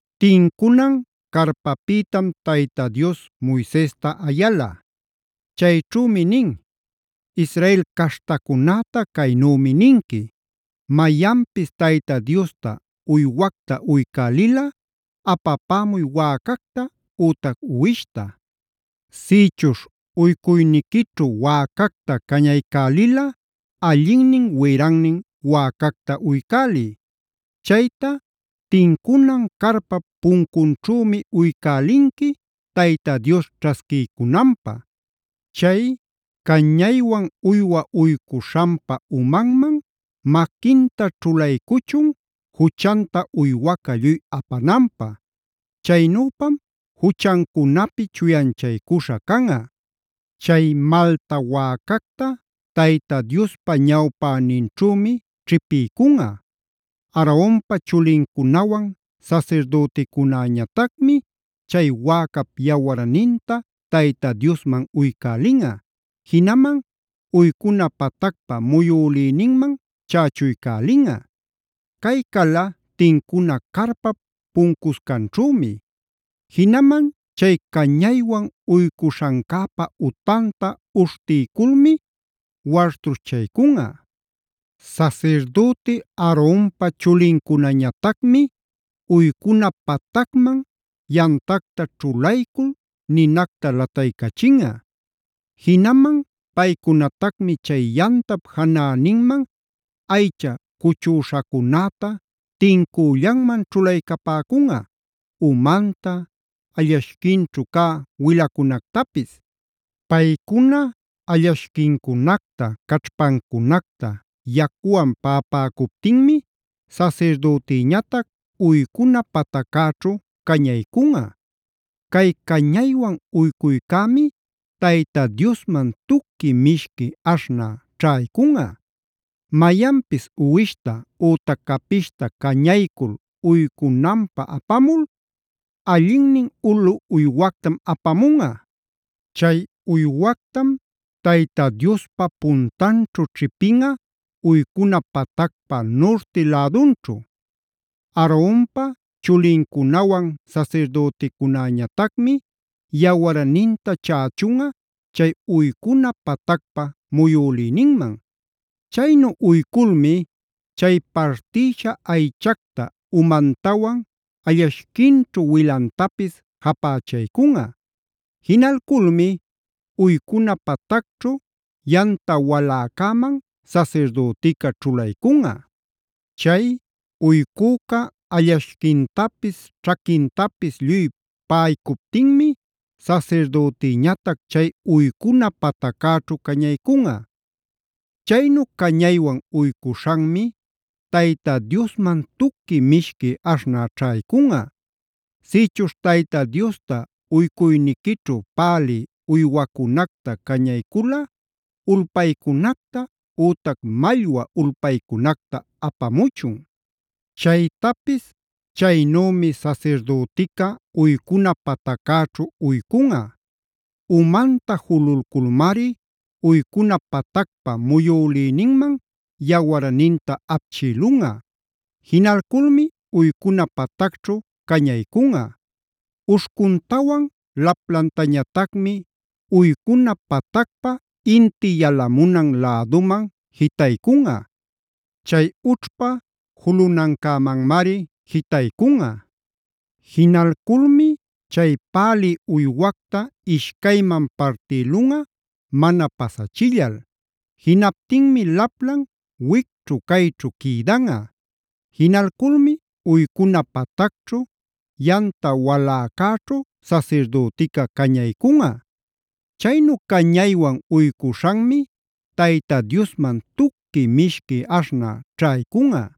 Tincunan carpäpïtam Tayta Dios Moisesta ayala. Chayćhümi nin: “Israel caśhtacunäta caynümi ninqui: Mayanpis Tayta Diosta uywacta uycälilꞌa apapämuy wäcacta ütac uwishta. “Sïchuśh uycuyniquićhu wäcacta cañaycälilꞌa allinnin wirannin wäcacta uycäliy. Chayta tincunan carpap puncunćhümi uycälinqui Tayta Dios ćhasquiycunanpä. Chay cañaywan uywa uycuśhanpa umanman maquinta ćhulaycuchun, juchanta uywaca lluy apananpä. Chaynüpam juchancunapi chuyanchaycuśha canꞌa. Chay malta wäcacta Tayta Diospa ñawpäninćhümi ćhipiycunꞌa. Aaronpa chulincunawan sasirdüticunäñatacmi chay wäcap yawarninta Tayta Diosman uycälinꞌa, jinaman uycuna patacpä muyülïninman chächuycälinꞌa. Chay cala tincuna carpap puncuscanćhümi. Jinaman chay cañaywan uycuśhancäpä utanta uśhtiyculmi wartuśhchaycunꞌa. Sasirdüti Aaronpa chulincunañatacmi uycuna patacman yamtacta ćhulaycul ninacta lataycachinꞌa. Jinaman paycunatacmi chay yamtap janäninman aycha cuchüśhacunäta tincüllanman ćhulaycapäcunꞌa: umanta, allashquinćhu cä wilacunactapis. Paycuna allashquincunacta, caćhpancunacta yacuwan paꞌapäcuptinmi sasirdütïñatac uycuna pataccäćhu cañaycunꞌa. Cay cañaywan uycuycämi Tayta Diosman tuqui mishqui aśhnä ćhaycunꞌa. “Mayanpis uwishta ütac capishta cañaycul uycunanpä apamul allinnin ulu uywactam apamunꞌa. Chay uywactam Tayta Diospa puntanćhu ćhipinꞌa uycuna patacpa nurti lädunćhu. Aaronpa chulincuna, sasirdüticunäñatacmi yawarninta chächunꞌa chay uycuna patacpa muyülïninman. Chaynu uyculmi chay partïsha aychacta, umantawan allashquinćhu wilantapis japächaycunꞌa. Jinalculmi uycuna patacćhu yamta waläcäman sasirdütica ćhulaycunꞌa. Chay uycüca allashquintapis, ćhaquintapis lluy paꞌaycuptinmi sasirdütiñatac chay uycuna pataccäćhu cañaycunꞌa. Chaynu cañaywan uycuśhanmi Tayta Diosman tuqui mishqui aśhnä ćhaycunꞌa. “Sïchuśh Tayta Diosta uycuyniquićhu pälï uywacunacta cañaycula ulpaycunacta ütac mallwa ulpaycunacta apamuchun. Chaytapis chaynümi sasirdütica uycuna pataccäćhu uycunꞌa. Umanta jululculmari uycuna patacpa muyülïninman yawarninta apchïlunꞌa. Jinalculmi uycuna patacćhu cañaycunꞌa. Uśhcuntawan laplantañatacmi uycuna patacpa inti yalamunan läduman jitaycunꞌa. Chay ućhpa julunancämanmari jitaycunꞌa. Jinalculmi chay pälï uywacta ishcayman partïlunꞌa mana pasachillal. Jinaptinmi laplan wicćhu cayćhu quïdanꞌa. Jinalculmi uycuna patacćhu yamta waläcäćhu sasirdütica cañaycunꞌa. Chaynu cañaywan uycuśhanmi Tayta Diosman tuqui mishqui aśhnä ćhaycunꞌa”.